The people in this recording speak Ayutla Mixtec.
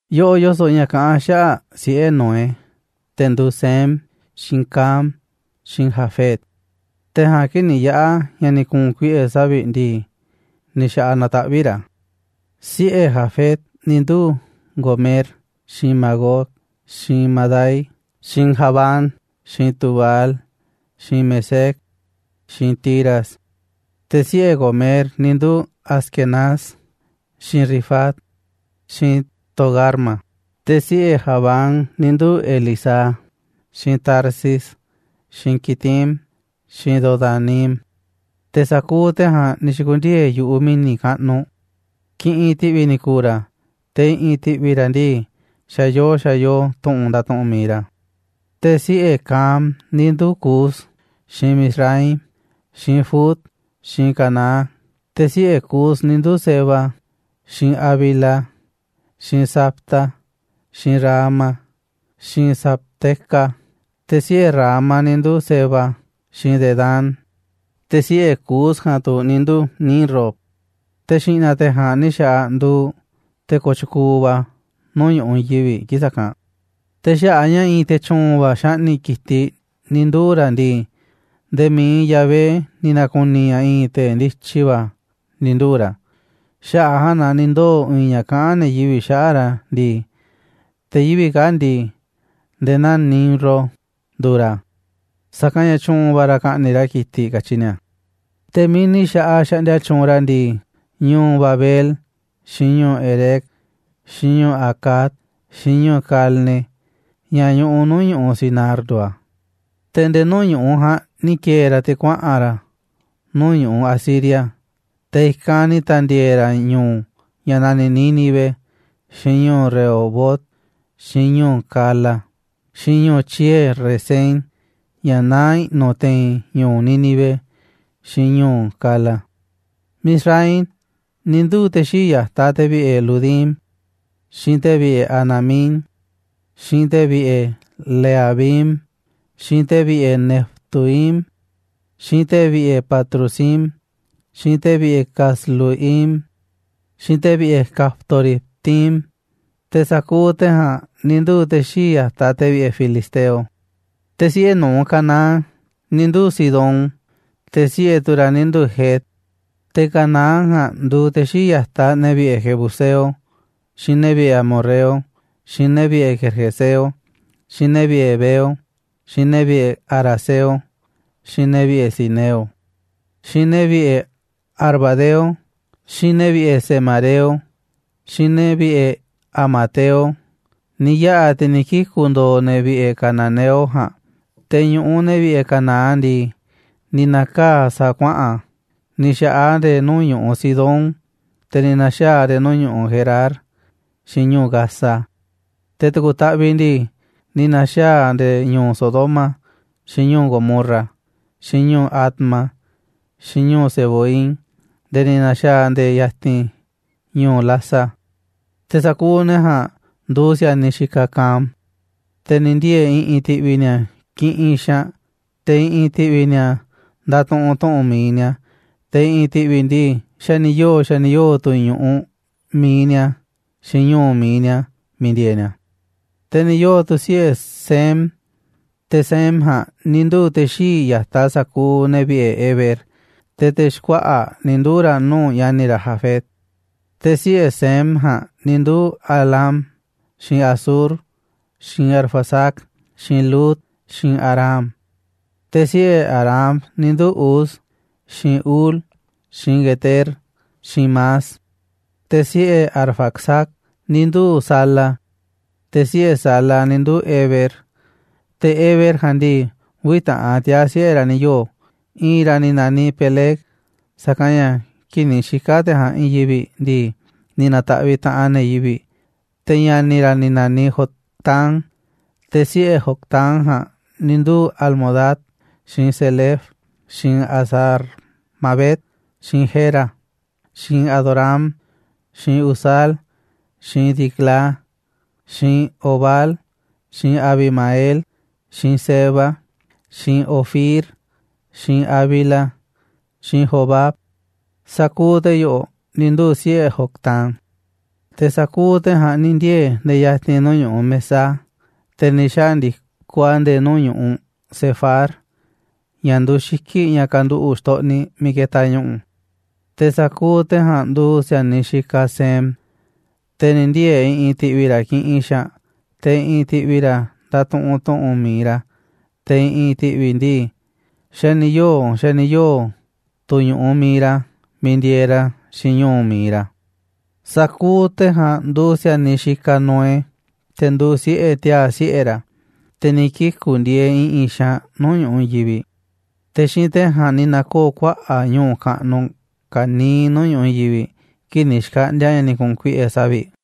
Yoꞌoꞌ yoso̱ꞌ ña̱ kaꞌán xaꞌa̱ꞌ siꞌe̱ Noé, te̱ nduuꞌ Sem, xiinꞌ Cam, xiinꞌ Jafet, te̱ ja̱a̱nꞌ, kii̱ꞌ ni̱ yaꞌa̱ ña̱ ni̱ ku̱u̱n kuiꞌe̱ savi̱ꞌ ndii, ni̱ xa̱ꞌaꞌ nataꞌvíꞌ ra̱. Siꞌe̱ Jafet ni̱ nduu̱ Gomer, xiinꞌ Magog, xiinꞌ Madai, xiinꞌ Javán, xiinꞌ Tubal, xiinꞌ Mesec, xiinꞌ Tiras. Te̱ siꞌe̱ Gomer ni̱ nduu̱ Askenaz, xiinꞌ Rifat, xiinꞌ Togarma. Te̱ siꞌe̱ Javán ni̱ nduu̱ Elisá, xiinꞌ Tarsis, xiinꞌ Quitim, xiinꞌ Dodanim. Te̱ sa̱kuuꞌ te̱ ja̱a̱nꞌ ni̱ xi̱ku̱ndiee̱ yu̱ꞌuꞌ mi̱ni̱ kaꞌnuꞌ, kiꞌinꞌ ti̱ꞌvi̱ ni̱ ku̱u̱ ra̱, te̱ i̱ꞌi̱n ti̱ꞌvi̱ ra̱ ndii, xa̱ yoo xa̱ yoo tu̱ꞌu̱n ndatuꞌunꞌ mi̱iꞌ ra̱. Te̱ siꞌe̱ Cam ni̱ nduu̱ Cus, xiinꞌ Mizraim, xiinꞌ Fut, xiinꞌ Canaán. Te̱ siꞌe̱ Cus ni̱ nduu̱ Seba, xiinꞌ Havila, xiinꞌ Sabta, xiinꞌ Raama, xiinꞌ Sabteca. Te̱ siꞌe̱ Raama ni̱ nduu̱ Seba xiinꞌ Dedán. Te̱ siꞌe̱ Cus ja̱a̱nꞌ tu̱ ni̱ nduu̱ Nimrod, te̱ xi̱ꞌna̱ te̱ ja̱a̱nꞌ ni̱ xa̱ꞌaꞌ nduuꞌ te̱ kooꞌ tyukuuꞌ va̱ nuu̱ꞌ ñu̱ꞌuꞌ i̱i̱n yivi̱ꞌ kii̱ꞌ sa̱kanꞌ. Te̱ xaꞌa̱ꞌ a̱ ña̱ i̱i̱n te̱ tyu̱u̱n va̱ xaꞌni̱ꞌ ki̱tiꞌ ni̱ nduu̱ ra̱ ndii, nde̱e̱ mi̱iꞌ Yahvé ni̱ na̱ku̱ni̱ ña̱ i̱i̱n te̱ ndityi va̱ ni̱ nduu̱ ra̱, xaꞌa̱ꞌ a̱ ja̱a̱nꞌ na ni̱ ndoo̱ i̱i̱n ña̱ kaꞌán ne̱ yivi̱ꞌ xaꞌa̱ꞌ ra̱ ndii: «Te̱ yivi̱ꞌ kaa̱ꞌ ndii, nde̱e̱ naa Nimrod nduuꞌ ra̱, sa̱kanꞌ ña̱ tyu̱u̱n va̱ ra̱ ka̱ꞌni̱ꞌ ra̱ ki̱tiꞌ, katyi ni̱a̱». Te̱ miiꞌ ni̱ xa̱ꞌaꞌ xaꞌndia tyuunꞌ ra̱ ndii, ñu̱u̱ Babel, xiinꞌ ñu̱u̱ Erec, xiinꞌ ñu̱u̱ Acad, xiinꞌ ñu̱u̱ Calne, ña̱ ñuꞌuꞌ nuu̱ꞌ ñu̱ꞌuꞌ Sinar, nduuꞌ a̱. Te̱ nde̱e̱ nuu̱ꞌ ñu̱ꞌuꞌ ja̱a̱nꞌ ni̱ ki̱e̱e̱ ra̱ te̱ kuaꞌa̱n ra̱ nuu̱ꞌ ñu̱ꞌuꞌ Asiria, te̱ i̱kanꞌ ni̱ ta̱ndi̱e̱e̱ ra̱ ñu̱u̱ ña̱ naniꞌ Nínive, xiinꞌ ñu̱u̱ Rehobot, xiinꞌ ñu̱u̱ Cala, xiinꞌ ñu̱u̱ tyie̱ Resén, ña̱ naá i̱ꞌnu̱ te̱i̱n ñu̱u̱ Nínive xiinꞌ ñu̱u̱ Cala. Mizraim ni̱ nduu̱ te̱ xii̱ꞌ ya̱taꞌ te̱ vi̱ꞌe̱ Ludim, xiinꞌ te̱ vi̱ꞌe̱ Anamim, xiinꞌ te̱ vi̱ꞌe̱ Lehabim, xiinꞌ te̱ vi̱ꞌe̱ Naftuhim, xiinꞌ te̱ vi̱ꞌe̱ Patrusim, xiinꞌ te̱ vi̱ꞌe̱ Casluhim, xiinꞌ te̱ vi̱ꞌe̱ Caftoritim. Te̱ sa̱kuuꞌ te̱ ja̱a̱nꞌ tu̱ ni̱ nduu̱ te̱ xii̱ꞌ ya̱taꞌ te̱ vi̱ꞌe̱ filisteo. Te̱ siꞌe̱ nu̱uꞌ Canaán ni̱ nduu̱ Sidón, te̱ siꞌe̱ tu̱ ra̱ ni̱ nduu̱ Het. Te̱ Canaán ja̱a̱nꞌ nduuꞌ te̱ xii̱ꞌ ya̱taꞌ ne̱ vi̱ꞌe̱ jebuseo, xiinꞌ ne̱ vi̱ꞌe̱ amorreo, xiinꞌ ne̱ vi̱ꞌe̱ gergeseo, xiinꞌ ne̱ vi̱ꞌe̱ heveo, xiinꞌ ne̱ vi̱ꞌe̱ araceo, xiinꞌ ne̱ vi̱ꞌe̱ sineo, xiinꞌ ne̱ vi̱ꞌe̱ arvadeo, xiinꞌ ne̱ vi̱ꞌe̱ zemareo, xiinꞌ ne̱ vi̱ꞌe̱ hamateo. Ni̱ yaꞌa̱ te̱ ni̱ kiku̱ ndo̱o̱ ne̱ vi̱ꞌe̱ cananeo ja̱a̱nꞌ. Te̱ ñu̱ꞌuꞌ ne̱ vi̱ꞌe̱ Canaán ndii, ni̱ na̱kaa̱ꞌ a̱ sa̱a̱ kuaꞌa̱n, ni̱ xa̱ꞌaꞌ a̱ nde̱e̱ nuu̱ꞌ ñu̱ꞌuꞌ Sidón, te̱ ni̱ na̱xaa̱ a̱ nde̱e̱ ñu̱u̱ Gerar xiinꞌ ñu̱u̱ Gaza, te̱ tu̱ku̱ taꞌviꞌ ndii, ni̱ na̱xaa̱ a̱ nde̱e̱ ñu̱u̱ Sodoma xiinꞌ ñu̱u̱ Gomorra, xiinꞌ ñu̱u̱ Adma, xiinꞌ ñu̱u̱ Zeboim nde̱e̱ ni̱ na̱xa̱a̱ a̱ nde̱e̱ ya̱ti̱n ñu̱u̱ Lasa. Te̱ sa̱kuuꞌ ne̱ ja̱a̱nꞌ nduuꞌ si̱a̱niꞌ xikaꞌ Cam, te̱ ni̱ ndiee̱ i̱ꞌi̱n ti̱ꞌvi̱ ni̱a̱ kiꞌinꞌ xaanꞌ, te̱ i̱ꞌi̱n ti̱ꞌvi̱ ni̱a̱ ndatuꞌunꞌ tu̱ꞌu̱n mi̱iꞌ ni̱a̱, te̱ i̱ꞌi̱n ti̱ꞌvi̱ ndii, xa̱ ni̱ yoo̱, xa̱ ni̱ yoo̱ tu̱ ñu̱ꞌuꞌ mi̱iꞌ ni̱a̱, xiinꞌ ñu̱u̱ mi̱iꞌ ni̱a̱ miiꞌ ndieeꞌ ni̱a̱. Te̱ ni̱ yoo̱ tu̱ siꞌe̱ Sem, te̱ Sem ja̱a̱nꞌ ni̱ nduu̱ꞌ te̱ xii̱ꞌ ya̱taꞌ sa̱kuuꞌ ne̱ vi̱ꞌe̱ Heber, te̱ te̱ xkuaꞌa̱ꞌ ni̱ nduu̱ ra̱ nuu̱ꞌ ña̱ni̱ ra̱ Jafet. Te̱ siꞌe̱ Sem ja̱a̱nꞌ ni̱ nduu̱ Elam, xiinꞌ Asur, xiinꞌ Arfaxad, xiinꞌ Lud, xiinꞌ Aram. Te̱ siꞌe̱ Aram ni̱ nduu̱ Uz, xiinꞌ Hul, xiinꞌ Geter, xiinꞌ Mas. Te̱ siꞌe̱ Arfaxad ni̱ nduu̱ꞌ Sala, te̱ siꞌe̱ Sala ni̱ nduu̱ꞌ Heber. Te̱ Heber ja̱a̱nꞌ ndii, uvi̱ taꞌan tiaa̱ siꞌe̱ ra̱ ni̱ yoo̱. I̱i̱n ra̱ ni̱ naniꞌ Peleg, sa̱kanꞌ ña̱ kii̱ꞌ ni̱ xika̱ te̱ ja̱a̱nꞌ i̱i̱n yivi̱ꞌ ndii, ni̱ na̱ta̱ꞌviꞌ taꞌanꞌ ne̱ yivi̱ꞌ, te̱ ña̱ni̱ ra̱ ni̱ na̱niꞌ Joctán. Te̱ siꞌe̱ Joctán ja̱a̱nꞌ ni̱ nduu̱ Almodad, xiinꞌ Selef, xiinꞌ Hazar-mavet, xiinꞌ Jera, xiinꞌ Adoram, xiinꞌ Uzal, xiinꞌ Diclá, xiinꞌ Obal, xiinꞌ Abimael, xiinꞌ Seba, xiinꞌ Ofir, xiinꞌ Havila, xiinꞌ Jobab. Sa̱kuuꞌ te̱ yo̱ꞌo̱ ni̱ nduu̱ siꞌe̱ Joctán. Te̱ sa̱kuuꞌ te̱ ja̱a̱nꞌ ni̱ ndiee̱ nde̱e̱ ya̱ti̱n nuu̱ꞌ ñu̱ꞌuꞌ Mesá, te̱ ni̱ xandi̱koꞌ a̱ nde̱e̱ nuu̱ꞌ ñu̱ꞌuꞌ Sefar, ña̱ nduuꞌ xiki̱ꞌ ña̱ kanduꞌu̱ꞌ xtoꞌniꞌ miiꞌ ketaꞌ ñu̱ꞌu̱. Te̱ sa̱kuuꞌ te̱ ja̱a̱nꞌ nduuꞌ si̱a̱niꞌ xikaꞌ Sem, te̱ ni̱ ndiee̱ i̱ꞌi̱n ti̱ꞌvi̱ ra̱ kiꞌinꞌ xaanꞌ, te̱ i̱ꞌi̱n ti̱ꞌvi̱ ra̱ ndatuꞌunꞌ tu̱ꞌu̱n mi̱iꞌ ra̱, te̱ i̱ꞌi̱n ti̱ꞌvi̱ ndii, xa̱ ni̱ yoo̱, xa̱ ni̱ yoo̱ tu̱ ñu̱ꞌuꞌ mi̱iꞌ ra̱ miiꞌ ndieeꞌ ra̱ xiinꞌ ñu̱u̱ mi̱iꞌ ra̱. Sa̱kuuꞌ te̱ ja̱a̱nꞌ nduuꞌ si̱a̱niꞌ xikaꞌ Noé, te̱ nduuꞌ siꞌe̱ tiaa̱ siꞌe̱ ra̱, te̱ ni̱ kiku̱ ndieeꞌ i̱ꞌi̱n xaanꞌ nuu̱ꞌ ñu̱ꞌuꞌ i̱i̱n yivi̱ꞌ. Te̱ xiinꞌ te̱ ja̱a̱nꞌ ni̱ na̱koo̱ kuaꞌa̱ꞌ ñu̱u̱ kaꞌnuꞌ ka̱niiꞌ nuu̱ꞌ ñu̱ꞌuꞌ i̱i̱n yivi̱ꞌ, kii̱ꞌ ni̱ xkaꞌndi̱a̱ ña̱ ni̱ ku̱u̱n kuiꞌe̱ savi̱ꞌ.